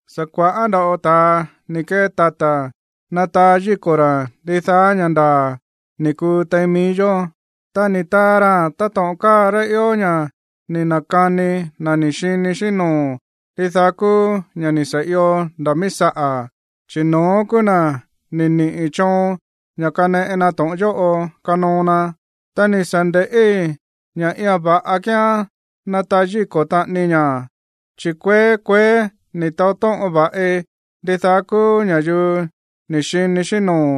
Sa̱ kua̱ꞌá nda̱ꞌo ta̱a ni̱ kee tata̱ nataa yíko̱ ra̱ ndidaá ña̱ ndaa̱ ni̱ kuu tein mií yó. Ta ni̱ taa raa̱n táto̱ꞌon káa rá ió ña̱ ni̱ na̱kani na̱ ni̱ xini xíꞌín noo̱ ndidaá kúú ña̱ ni̱ sa̱ io nda̱ míí saꞌa̱, chi̱ no̱ón kúú na̱ ni̱ niꞌi̱ choon ña̱ kaneꞌe na to̱ꞌon yóꞌo kanoo na. Ta ni̱ sa̱ nde̱ꞌí ña̱ iia̱n va̱ꞌa kíán nataa yíko̱ taꞌanii ña̱. Chi̱ kueé kueé ni̱ taó tóꞌon va̱ꞌi ndidaá kúú ña̱yuu ni̱ xini xíꞌín noo̱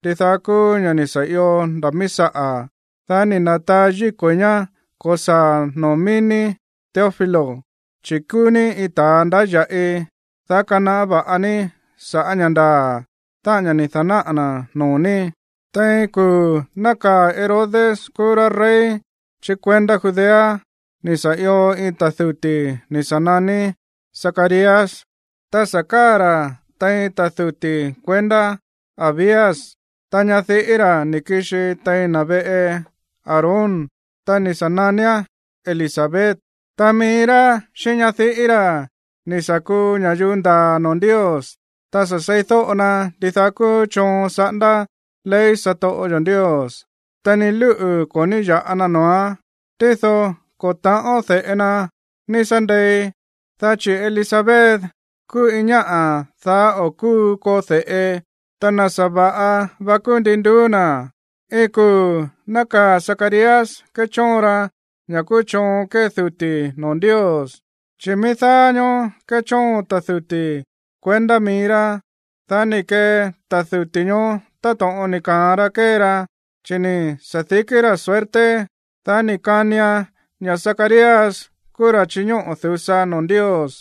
ndidaá kúú ña̱ ni̱ sa̱ io nda̱ míí saꞌa̱, dá ni̱ na̱taa yíko̱i̱ ñá ko̱saa̱a̱n noo̱ mií ní, Teófilo, chi̱ kúú ní iin ta̱a ndáya̱ꞌi, dá kanaꞌá va̱ꞌa ní sa̱ꞌá ña̱ ndaa̱, táꞌa̱n ña̱ ni̱ da̱náꞌa̱ na̱ noo̱ ní. Tein kuu̱ nákaa̱ Herodes kúú rá rey chí kuendá Judea, ni̱ sa̱ io iin ta̱ duti̱ ni̱ sa̱ naní Zacarías, ta sa̱ káa̱ ra̱ tein ta̱ duti̱ kuendá Abías. Ta ñadiꞌí ra̱ ni̱ kixi tein na̱ veꞌe Aarón, ta ni̱ sa̱ naníán Elisabet. Ta mií rá xíꞌín ñadiꞌí ra̱ ni̱ sa̱ kuu ña̱yuu ndaa̱ noo̱ Ndios, ta sa̱ seídóꞌo na ndidaá kúú choon saꞌándá ley satoꞌo yo̱ Ndios, ta ni lúꞌu̱ ko̱ ní ya̱ꞌa na noo̱án. Tído ko̱ ta̱ꞌón de̱ꞌe na ní sá ndei, dá chi̱ Elisabet kúú iin ñáꞌa̱ daá o̱ kúu koo de̱ꞌe. Ta na̱ sa̱va̱ꞌa va kúú ndin nduú na̱. Iin kuu̱ nákaa̱ Zacarías kéchóon ra ña̱ kúú choon kée duti̱ noo̱ Ndios, chi̱ mií daá ñóó kéchóon ta̱ duti̱ kuendá mií rá. Dá ni̱ kee ta̱ duti̱ ñoó táto̱ꞌon ni̱ ka̱an ra kée ra, chi̱ ni̱ sa̱dikí ra̱ suerte, dá ni̱ kanian ña̱ Zacarías kúú ra̱ chiñóꞌo̱ du̱sa noo̱ Ndios.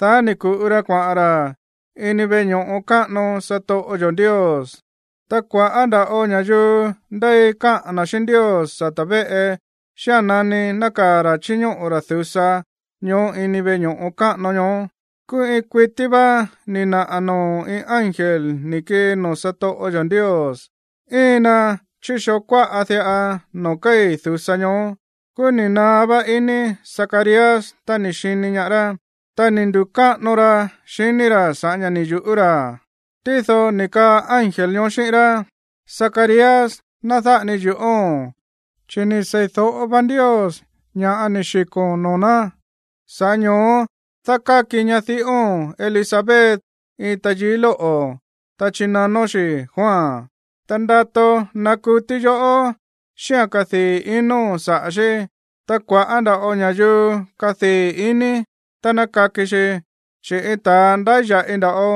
Dá ni̱ ku̱ꞌu ra kuaꞌa̱n ra̱ ini veꞌe ño̱ꞌo káꞌano satoꞌo yo̱ Ndios. Ta kua̱ꞌá nda̱ꞌo ña̱yuu ndéi káꞌa̱n na̱ xíꞌín Ndios sata̱ véꞌe xía̱n nani nákaa̱ ra̱ chíñóꞌo̱ ra̱ du̱sa ñoó ini veꞌe ño̱ꞌo káꞌano ñoó. Kúú iin kuití vá ni̱ naꞌa̱ noo̱ iin ángel ni̱ kii noo̱ satoꞌo yo̱ Ndios, íin na chí xoo kuáꞌa diꞌa noo̱ kéi̱ du̱sa ñoó. Kúú ni̱ naá vá ini Zacarías tá ni̱ xini ñaá rá, ta ni̱ ndu̱káꞌano ra xiní ra̱ sa̱ꞌá ña̱ ni̱ yu̱ꞌú ra̱. Tído ni̱ kaa ángel ñoó xíꞌín rá: ―Zacarías, ná dáꞌa ni yu̱ꞌóo̱n, chi̱ ni̱ seídóꞌo va Ndios ña̱ ni̱ xiko̱n noo̱ ná. Sa̱ꞌá ño̱ó dákáki ñadiꞌóo̱n Elisabet iin tayií lóꞌo̱, ta chinanón xi̱ Juan. Ta ndato nakutí yoꞌó xíꞌa̱n kadii̱ ino̱n saꞌa̱ xí. Ta kua̱ꞌá nda̱ꞌo ña̱yuu kadii̱ iní tá ná kaki xi, chi̱ iin ta̱a ndáya̱ꞌi nda̱ꞌo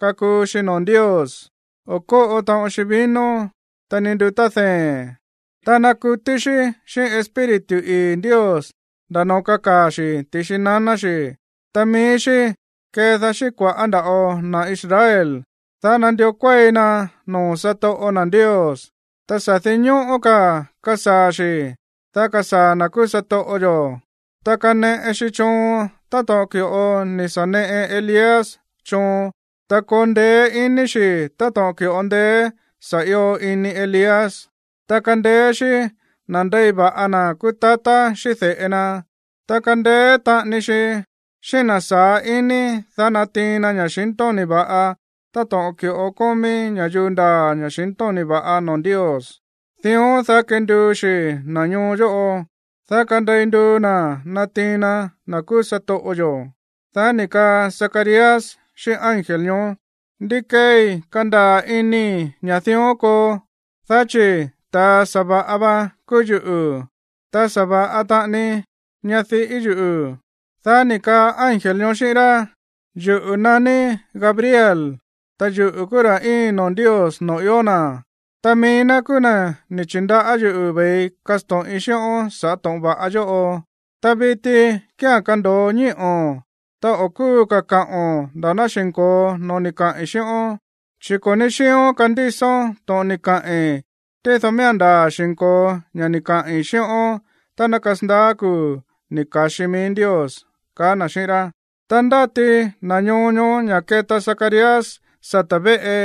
kakuu xi noo̱ Ndios. O̱ kóꞌo taꞌon xi vino, ta ni ndutá dee̱n. Ta nakutí xí xíꞌín Espíritu ii̱ Ndios nda̱ noo̱ kakaa̱ xi̱ ti̱xi naná xi̱. Ta mií xí kedaá xíꞌín kua̱ꞌá nda̱ꞌo na̱ Israel, dá nandió kuéi na noo̱ satoꞌo na̱ Ndios. Ta sa̱ dinñóꞌó ka̱ kasaa̱ xi̱, dá kasaa̱ na̱ kúú satoꞌo yo̱. Ta kaneꞌe xi choon táto̱ꞌon ki̱ꞌo ni̱ sa̱ neꞌe Elías choon, ta koo ndeé iní xi̱ táto̱ꞌon ki̱ꞌo ndeé sa̱ io ini Elías. Ta kandeé xí nandei va̱ꞌa na̱ kúú tatá xíꞌín de̱ꞌe na. Ta kandeé taꞌani xi xíꞌín na̱ saá ini, dá natiin na ña̱xintóni̱ va̱ꞌa táto̱ꞌon ki̱ꞌo kómí ña̱yuu ndaa̱ ña̱xintóni̱ va̱ꞌa noo̱ Ndios. Dión, dá kenduu xi̱ na̱ ñoo yóꞌo, dá kandei nduu na̱ natiin na na̱ kúú satoꞌo yo̱. Dá ni̱ kaa Zacarías xíꞌín ángel ñoó: ―¿Ndí keei kandaa̱ inii̱ ña̱ dión koo? Dá chi̱ ta̱a sa̱va̱ꞌa va kúú yuꞌu̱, ta sa̱va̱ꞌa taꞌani ñadiꞌí yuꞌu̱. Dá ni̱ kaa ángel ñoó xíꞌín rá: ―Yuꞌu̱ naní Gabriel, ta yuꞌu̱ kúú ra̱ íin noo̱ Ndios noo̱ ió na̱. Ta mií ná kúú na̱ ni̱ chi̱ndaꞌá yuꞌu̱ ve̱ii kasto̱ꞌin xíꞌón sa̱ꞌá to̱ꞌon va̱ꞌa yóꞌo. Ta viti kía̱n kando̱o ñíꞌo̱n, ta o̱ kúu ka̱ kaꞌo̱n nda̱ ná xi̱nko̱o no̱ó ni̱ kaꞌi̱n xíꞌón, chi̱ ko̱ ní xíión kandísón to̱ꞌon ni̱ kaꞌi̱n, tído miía̱n ndaa̱ xi̱nko̱o ña̱ ni̱ kaꞌi̱n xíꞌón tá ná kasandaá kuu̱ ni̱ ka̱xi mií Ndios ―kaá na̱ xíꞌín rá. Ta ndáti na̱ ñoo ñoó ña̱ keta Zacarías sata̱ véꞌe.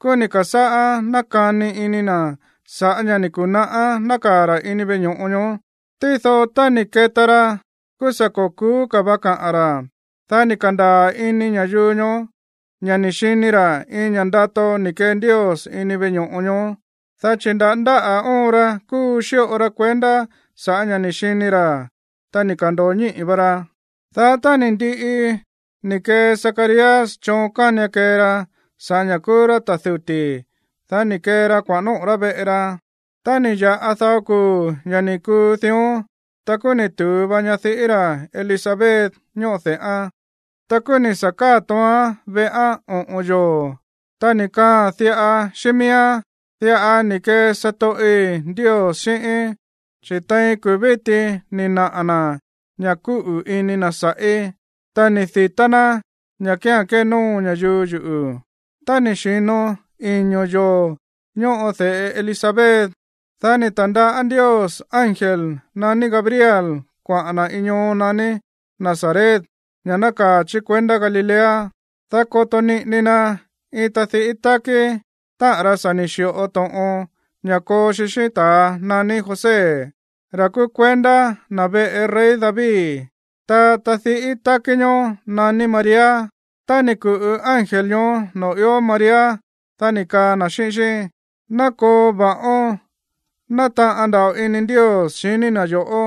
Kúú ni̱ ka̱sáꞌá nákani ini na̱ sa̱ꞌá ña̱ ni̱ ku̱naꞌá nákaa̱ ra̱ ini veꞌe ño̱ꞌo ñoó. Tído tá ni̱ keta ra, kúú sa̱ ko̱ ku̱ú ka̱ va kaꞌa̱n ra̱. Dá ni̱ ka̱ndaa̱ ini ña̱yuu ñoó ña̱ ni̱ xini ra̱ iin ña̱ꞌa ndato ni̱ kee Ndios ini veꞌe ño̱ꞌo ñoó, dá chi̱ nda̱ ndáꞌa̱ óon ra kúu xíꞌo ra kuendá sa̱ꞌá ña̱ ni̱ xini ra̱. Ta ni̱ ka̱ndo̱o ñíꞌi̱ va ra. Dá tá ni̱ ndiꞌi ni̱ kee Zacarías choon kánian kee ra sa̱ꞌá ña̱ kúú rá ta̱ duti̱, dá ni̱ kee ra kuaꞌa̱n nóꞌo̱ rá veꞌe ra. Ta ni̱ ya̱ꞌa dao kuu̱ ña̱ ni̱ kuu dión, ta kúú ni̱ tu̱u va ñadiꞌí ra̱ Elisabet ñóꞌo de̱ꞌán. Ta kúú ni̱ sa̱ káa̱ tóoán veꞌán oꞌo̱n yoo̱, ta ni̱ kaaa̱n diꞌa xíꞌín miíán: “Diꞌa ni̱ kee satoꞌi̱ Ndios xíꞌíín, chi̱ tein kuu̱ víti ni̱ naꞌa̱ na̱ ña̱ kúꞌu̱ ini na̱ sa̱ꞌí, ta ni̱ di̱tá ná ña̱ kía̱n kénóo ña̱yuu yuꞌu̱.” Tá ni̱ xi̱no iño̱ yoo̱ ñóꞌo de̱ꞌe Elisabet, dá ni̱ ta̱ndaꞌá Ndios ángel naní Gabriel kuaꞌa̱n na̱ iin ñoo naní Nazaret, ña̱ nákaa̱ chí kuendá Galilea, dá koto niꞌini na iin tadiꞌí tákí, táꞌa̱n ra sa̱ ni̱ xi̱ꞌo to̱ꞌon ña̱ koo xi xíꞌín ta̱a naní José, ra̱ kúú kuendá na̱ veꞌe rey David. Ta tadiꞌí tákí ñoó naní María. Tá ni̱ ku̱ꞌu ángel ñoó noo̱ ió María, dá ni̱ kaa na̱ xíꞌín xí: ―Ná koo va̱ꞌón. Nátaꞌan nda̱ꞌo ini Ndios xiní na̱ yo̱ꞌó,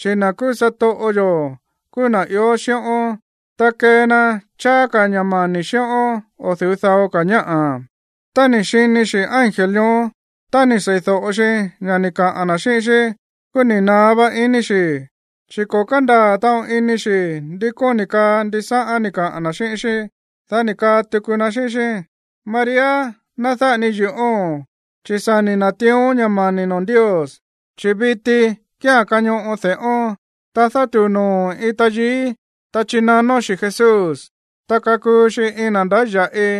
chi̱ na̱ kúú satoꞌo yo̱ kúú na̱ ió xíꞌón, ta kée na cháá ka̱ ña̱ mani̱ xíꞌón o̱ du̱ú dao ka̱ ñáꞌa̱. Tá ni̱ xini xi̱ ángel ñoó, ta ni̱ seídóꞌo xi ña̱ ni̱ kaꞌa̱n na̱ xíꞌín xí, kúú ni̱ naá vá iní xi̱, chi̱ ko̱ kándaa̱ taꞌon ini xi̱ ndi kóni̱ kaa ndisáꞌán ni̱ kaꞌa̱n na̱ xíꞌín xí. Dá ni̱ kaa tuku na xíꞌín xí: ―María, ná dáꞌa ni yu̱ꞌóo̱n, chi̱ sa̱ ni̱ na̱tiión ña̱ mani̱ noo̱ Ndios. Chi̱ viti kía̱n kañoꞌo de̱ꞌón. Ta dátu̱u noo̱o̱n iin tayií, ta chinanón xi̱ Jesús. Ta kakuu xi iin na̱ ndáya̱ꞌi,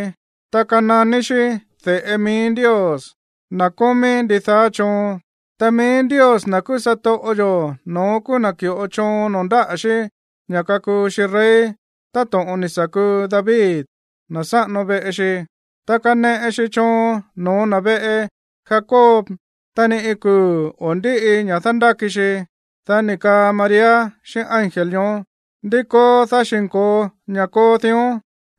ta kananí xí de̱ꞌe mií Ndios, na̱ kómí ndidaá choon. Ta mií Ndios, na̱ kúú satoꞌo yo̱, no̱ón kúú na̱ ki̱ꞌo choon noo̱ ndáꞌa̱ xí ña̱ kakuu xi rey, táto̱ꞌon ni̱ sa̱ kuu David, na̱ sáꞌano veꞌe xi. Ta kaneꞌe xi choon no̱ó na̱ veꞌe Jacob, ta ni iin kuu̱ o̱ ndíꞌi ña̱ dándáki xi. Dá ni̱ kaa María xíꞌín ángel ñoó: ―¿Ndí koo, dá xi̱nko̱o ña̱ koo dión,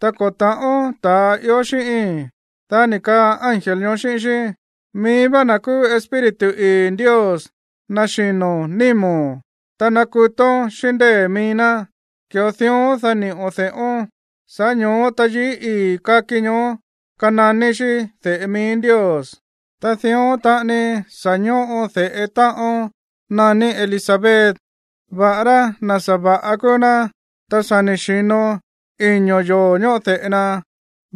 ta ko̱ ta̱ꞌón ta̱a ió xíꞌíi̱n? Dá ni̱ kaa ángel ñoó xíꞌín xí: ―Mií vá na̱ kúú Espíritu ii̱ Ndios naxino̱ nímo̱n, ta nakutón xíꞌín ndée̱ mií ná. Ki̱ꞌo dión, dá niꞌo̱n de̱ꞌón. Sa̱ꞌá ño̱ó tayií ii̱ kaki ñoó kananí xí de̱ꞌe mií Ndios. Ta dión taꞌani sa̱ ñóꞌo de̱ꞌe táꞌón naní Elisabet, va̱ꞌará na̱ sa̱va̱ꞌa kúú ná. Ta sa̱ ni̱ xi̱no iño̱ yoo̱ ñóꞌo de̱ꞌe na,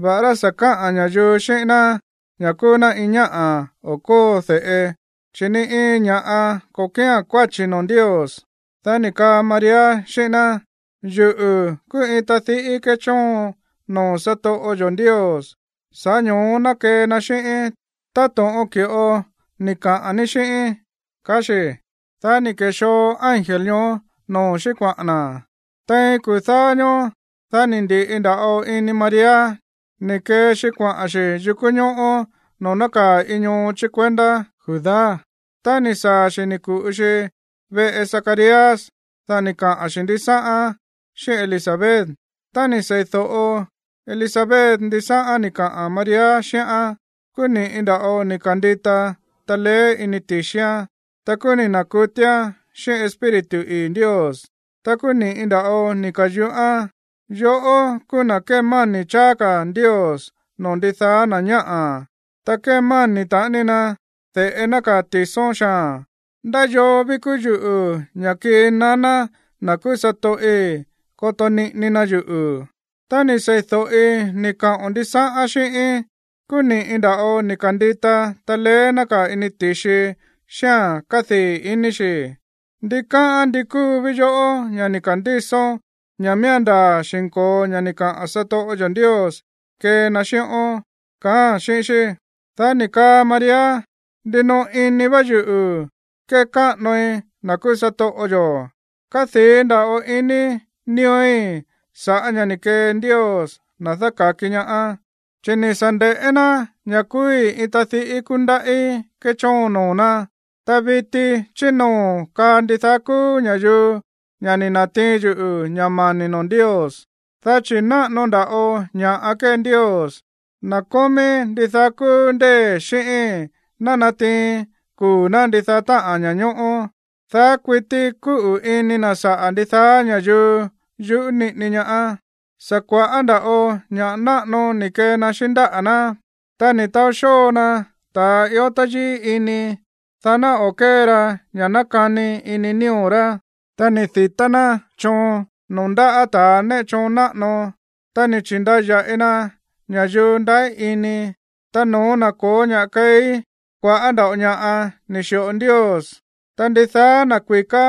va̱ꞌará sa̱ kaꞌa̱n ña̱yuu xíꞌín ná ña̱ kúú ná iin ñáꞌa̱ o̱ kóo de̱ꞌe, chi̱ ni iin ña̱ꞌa ko̱ kía̱n kuáchi̱ noo̱ Ndios. Dá ni̱ kaa María xíꞌín ná: ―Yuꞌu̱ kúú iin tadiꞌí kéchóon noo̱ satoꞌo yo̱ Ndios. Sa̱ꞌá ño̱ó ná kee na xíꞌíín táto̱ꞌon ki̱ꞌo ni̱ kaꞌa̱n ní xíꞌíín ―kaá xi̱. Dá ni̱ ke̱xoo ángel ñoó noo̱ xí kuaꞌa̱n na̱. Tein kuu̱ dáá ñóó, dá ni̱ ndi̱ꞌi nda̱ꞌo ini María ni̱ kee xi kuaꞌa̱n xi̱ yukú ñóꞌó noo̱ nákaa̱ iin ñoo chí kuendá Judá. Tá ni̱ saa̱ xi̱, ni̱ ku̱ꞌu xi veꞌe Zacarías. Dá ni̱ kaꞌa̱n xi̱ ndisáꞌán xíꞌín Elisabet. Tá ni̱ sei̱do̱ꞌo Elisabet ndisáꞌán ni̱ kaꞌa̱n María xíꞌán, kúú ni̱ꞌi nda̱ꞌo ni̱ ka̱ndita taleé ini ti̱xián. Ta kúú ni̱ na̱kutíán xíꞌín Espíritu ii̱ Ndios, ta kúú ni̱ꞌi nda̱ꞌo ni̱ ka̱yuꞌán: ―Yoꞌó kúú na̱ kémáni̱ cháá ka̱ Ndios noo̱ ndidaá na̱ ñáꞌa̱, ta kémáni̱ taꞌani na de̱ꞌe nákaa̱ ti̱són xaa̱n. ¿Ndá yoo ví kúú yuꞌu̱ ña̱ kii naná na̱ kúú satoꞌi̱ koto niꞌini na yuꞌu̱? Tá ni̱ sei̱do̱ꞌi ni̱ kaꞌo̱n ndisáꞌán xíꞌíín, kúú ni̱ꞌi nda̱ꞌo ni̱ ka̱ndita taleé nákaa̱ ini ti̱xii xíꞌa̱n kádii̱ iní xi̱. Ndikáꞌán ndi kúu ví yoꞌó ña̱ ni̱ ka̱ndísón ña̱ miía̱n ndaa̱ xi̱nko̱o ña̱ ni̱ kaꞌa̱n satoꞌo yo̱ Ndios kee na xíꞌón ―kaáa̱n xíꞌín xí. Dá ni̱ kaa María: Ndinoꞌo ini va yuꞌu̱ kékáꞌanoi na̱ kúú satoꞌo yo̱. Kádii̱ nda̱ꞌo ini nío̱í sa̱ꞌá ña̱ ni̱ kee Ndios, na̱ dáka̱ki ñaá. Chi̱ ni̱ sa̱ nde̱ꞌé ná ña̱ kúúí iin tadiꞌí kúndaꞌí kéchóon noo̱ ná. Ta viti chí noo̱ kaa ndidaá kúú ña̱yuu ña̱ ni̱ na̱tiin yuꞌu̱ ña̱ mani̱ noo̱ Ndios. Dá chi̱ náꞌano nda̱ꞌo ña̱ꞌa kée Ndios, na̱ kómí ndidaá kúú ndée̱, xíꞌíi̱n. Ná natiin kuu̱ ná ndidaá táꞌa̱n ña̱ñóꞌó. Daá kuití kúꞌu̱ ini na̱ saꞌa̱ ndidaá ña̱yuu yuꞌú niꞌini ñaá. Sa̱ kua̱ꞌá nda̱ꞌo ña̱ꞌa náꞌano ni̱ kee na xíꞌín ndáꞌa̱ ná. Ta ni̱ taó xóo na ta̱ ió táyíí ini, dá ná o̱ kée ra ña̱ nákani ini nío̱ rá. Ta ni̱ di̱tá ná choon noo̱ ndaꞌá ta̱ néꞌe choon náꞌano, ta ni̱ chi̱ndaya̱ꞌi na ña̱yuu ndaꞌí ini. Ta no̱ó na̱ ko̱ó ña̱ꞌa keí, kua̱ꞌá nda̱ꞌo ña̱ꞌa ni̱ xi̱ꞌo Ndios. Ta ndidaá na̱ kui̱ká,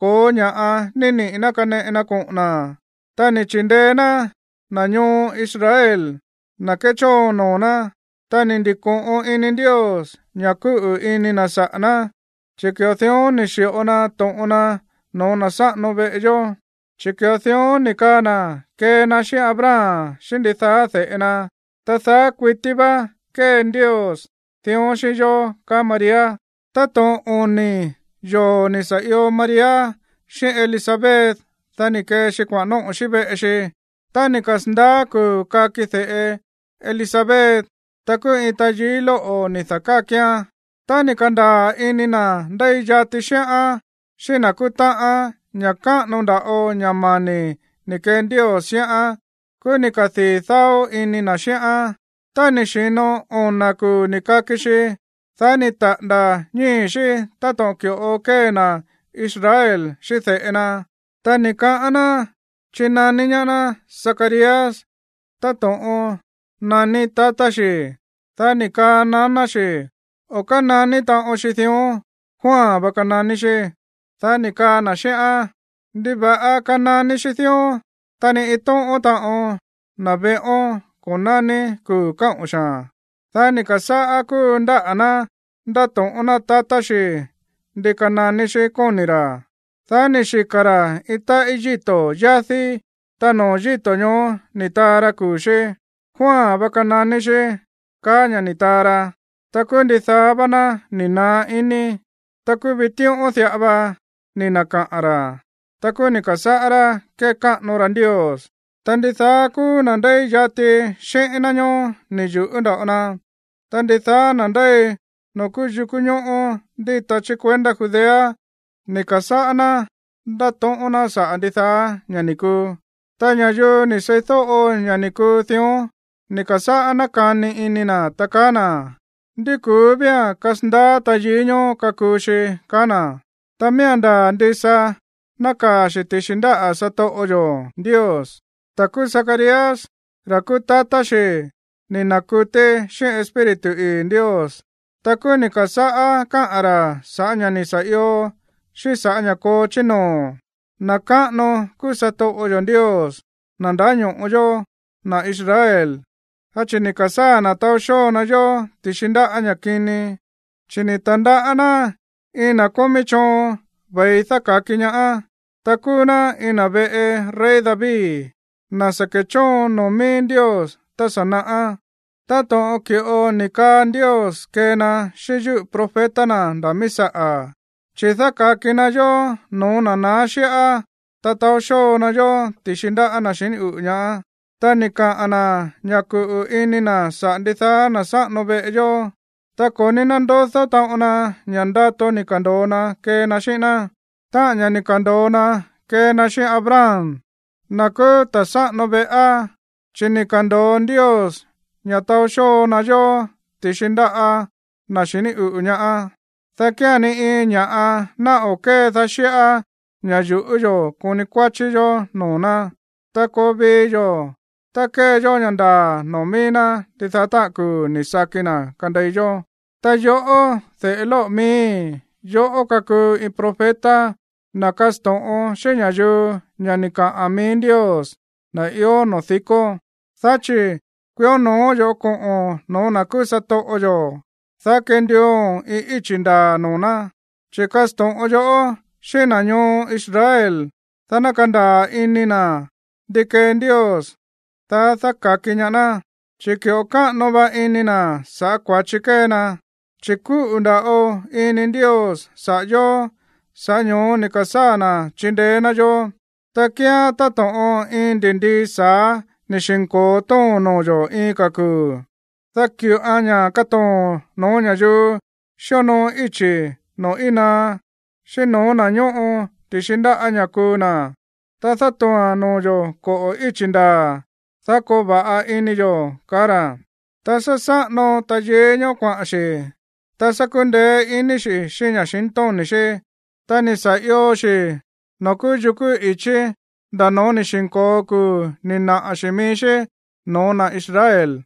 ko̱ó ña̱ꞌa ni̱ niꞌi̱ ná kaneꞌe na koꞌo̱n na̱. Ta ni̱ chi̱ndeé ná na̱ ñoo Israel, na̱ kéchóon noo̱ ná, ta ni̱ ndi̱ko̱ꞌon ini Ndios ña̱ kúꞌu̱ ini na̱ saꞌa̱ ná, chi̱ ki̱ꞌo dión ni̱ xi̱ꞌo na to̱ꞌon na no̱ó na̱ sáꞌano veꞌe yó, chi̱ ki̱ꞌo dión ni̱ kaa na̱ kee na xíꞌín Abraham xíꞌín ndidaá de̱ꞌe na, ta daá kuití vá kée Ndios dión xíꞌín yó. Táto̱ꞌon oni̱ yoo̱ ni̱ sa̱ io María xíꞌín Elisabet, dá ni̱ kee xi kuaꞌa̱n nóꞌo̱ xi veꞌe xi. Tá ni̱ kasa̱ndaá kuu̱ kaki de̱ꞌe Elisabet, ta kúú iin tayií lóꞌo̱ ni̱ da̱kákián. Tá ni̱ ka̱ndaa̱ ini na̱ ndéi yati xíꞌán xíꞌín na̱ kúú táꞌa̱n ña̱ káꞌano nda̱ꞌo ña̱ mani̱ ni̱ kee Ndios xíꞌán, kúú ni̱ kadii̱ dáó ini na̱ xíꞌán. Tá ni̱ xi̱no ona̱ kuu̱ ni̱ kaki xi, dá ni̱ taꞌa̱nda̱ ñíi̱ xí táto̱ꞌon ki̱ꞌo kée na̱ Israel xíꞌín de̱ꞌe na. Ta ni̱ kaꞌán ná chinaní ñaá ná Zacarías táto̱ꞌon naní tatá xi̱. Dá ni̱ kaa naná xi̱: ―O̱ kánaní taꞌon xi dión. Juan va kananí xí. Dá ni̱ kaa na̱ xíꞌán: ―¿Ndiva̱ꞌa kananí xí dión? Ta ni iin tóꞌón taꞌon na̱ veꞌón ko̱ naní kuu̱ káꞌo̱n xaa̱n. Dá ni̱ ka̱sáꞌá kúu ndáꞌa̱ ná ndáto̱ꞌón ná tatá xi̱ ndi kananí xí, kóni̱ ra̱. Dá ni̱ xika̱ ra̱ iin táꞌí yíto̱ yádí, ta noo̱ yíto̱ ñoó ni̱ taa ra kuu̱ xí. “Juan va kananí xí”, kaá ña̱ ni̱ taa ra. Ta kúú ndidaá vá ná ni̱ naá iní. Ta kúú vitíꞌón diꞌa va ni̱ na̱kaꞌa̱n ra̱. Ta kúú ni̱ ka̱sáꞌá rá kékáꞌano ra Ndios. Ta ndidaá kúú na̱ ndéi yati xíꞌín ná ñóó ni̱ yu̱ꞌú nda̱ꞌo na. Ta ndidaá na̱ ndéi noo̱ kúú yukú ñóꞌó ndíta chí kuendá Judea ni̱ ka̱sáꞌá ná ndátóꞌón ná saꞌa̱ ndidaá ña̱ ni̱ kuu. Ta ña̱yuu ni̱ seídóꞌo ña̱ ni̱ kuu dión, ni̱ ka̱sáꞌá nákani ini na̱, ta kaá na̱: ―¿Ndi ku̱ú vía̱n kasandaá tayií ñoó kakuu xi? ―kaá na̱. Ta miía̱n ndaa̱ ndisa nákaa̱ xi̱ ti̱xi ndáꞌa̱ satoꞌo yo̱ Ndios. Ta kúú Zacarías, ra̱ kúú tatá xi̱, ni̱ na̱kutí xíꞌín Espíritu ii̱ Ndios. Ta kúú ni̱ ka̱sáꞌá káꞌa̱n ra̱ sa̱ꞌá ña̱ ni̱ sa̱ io xíꞌín sa̱ꞌá ña̱ koo chí noo̱: Na̱ káꞌano kúú satoꞌo yo̱ Ndios, na̱ ndáño̱ꞌo yóó, na̱ Israel, dá chi̱ ni̱ ka̱sáa̱ na̱ taó xóo na yó ti̱xi ndáꞌa̱ ña̱ kini. Chi̱ ni̱ ta̱ndaꞌá ná iin na̱ kómí choon ve̱i dáka̱ki ñaá. Ta kúú ná iin na̱ veꞌe rey David, na̱ sa̱ ke̱chóon noo̱ mií Ndios tá sa̱ naꞌá, táto̱ꞌon ki̱ꞌo ni̱ kaa Ndios kee na xíꞌín yúꞌu̱ profeta na̱ nda̱ míí saꞌa̱. Chi̱ dáka̱ki na yó no̱ó na̱ naá xíꞌá, ta taó xóo na yó ti̱xi ndáꞌa̱ na̱ xiní uꞌu̱ ñaá. Ta ni̱ kaꞌa̱n na̱ ña̱ kuꞌu̱ ini na̱ saꞌa̱ ndidaá na̱ sáꞌano veꞌe yó. Ta ko̱ ní nándodó taꞌon na ña̱ ndato ni̱ ka̱ndo̱o na kee na xíꞌín ná, táꞌa̱n ña̱ ni̱ ka̱ndo̱o na kee na xíꞌín Abraham, na̱ kúú ta̱ sáꞌano veꞌá. Chi̱ ni̱ ka̱ndo̱o Ndios ña̱ taó xóo na yó ti̱xi ndáꞌa̱ na̱ xiní uꞌu̱ ñaá, dá kía̱n ni iin ña̱ꞌa ná o̱ kédaá xíꞌá ña̱ yu̱ꞌú yo̱ koni kuáchí yó noo̱ ná. Ta koo vii yo̱, ta kee yó ña̱ ndaa̱ noo̱ mií ná ndidaá táꞌa̱n kuu̱ ni̱ saki na̱ kandei yó. Ta yoꞌó, de̱ꞌe lóꞌo̱ miíi̱, yoꞌó kakuu iin profeta, na̱ kásto̱ꞌon xíꞌín ña̱yuu ña̱ ni̱ kaꞌa̱n mií Ndios, na̱ ió noo̱ dikó. Dá chi̱ kuió no̱ó yo̱ꞌó koꞌo̱n no̱ó na̱ kúú satoꞌo yo̱, dá kenduuo̱n iin íchi̱ ndaa̱ noo̱ ná. Chi̱ kasto̱ꞌon yoꞌó xíꞌín na̱ ñoo Israel, dá ná kandaa̱ ini na̱ ndi kee Ndios, dá dáka̱ki ñaá ná, chi̱ ki̱ꞌo káꞌano va ini na̱ sa̱ꞌá kua̱chi kée na. Chi̱ kúꞌu̱ nda̱ꞌo ini Ndios saꞌa̱ yo̱, sa̱ꞌá ño̱ó ni̱ ka̱sáa̱ na̱ chindeé ná yó, ta kíán táto̱ꞌon iin ndi̱ndii sa̱á ni̱ xi̱nko̱o too̱n noo̱ yo̱ iin ka̱ kuu̱, dá ki̱ꞌoan ña̱ katoo̱n no̱ó ña̱yuu xíonoo íchi̱ noo̱ íin naá, xíꞌín no̱ó na̱ ñóꞌo ti̱xi ndáꞌa̱ ña̱ kuu na̱. Ta dátoo̱a̱n noo̱ yo̱ koꞌo̱ ichí ndaa̱, dá koo va̱ꞌa ini yo̱. Ta sa̱ saꞌano tayií ñoó kuaꞌa̱n xi̱. Ta sa̱ kundeé ini xi̱ xíꞌín ña̱xintóni̱ xí. Ta ni̱ sa̱ io xi̱ noo̱ kúú yukú i̱chí nda̱ no̱ó ni̱ xi̱nko̱o kuu̱ ni̱ naꞌa̱ xi̱ mií xí no̱ó na̱ Israel.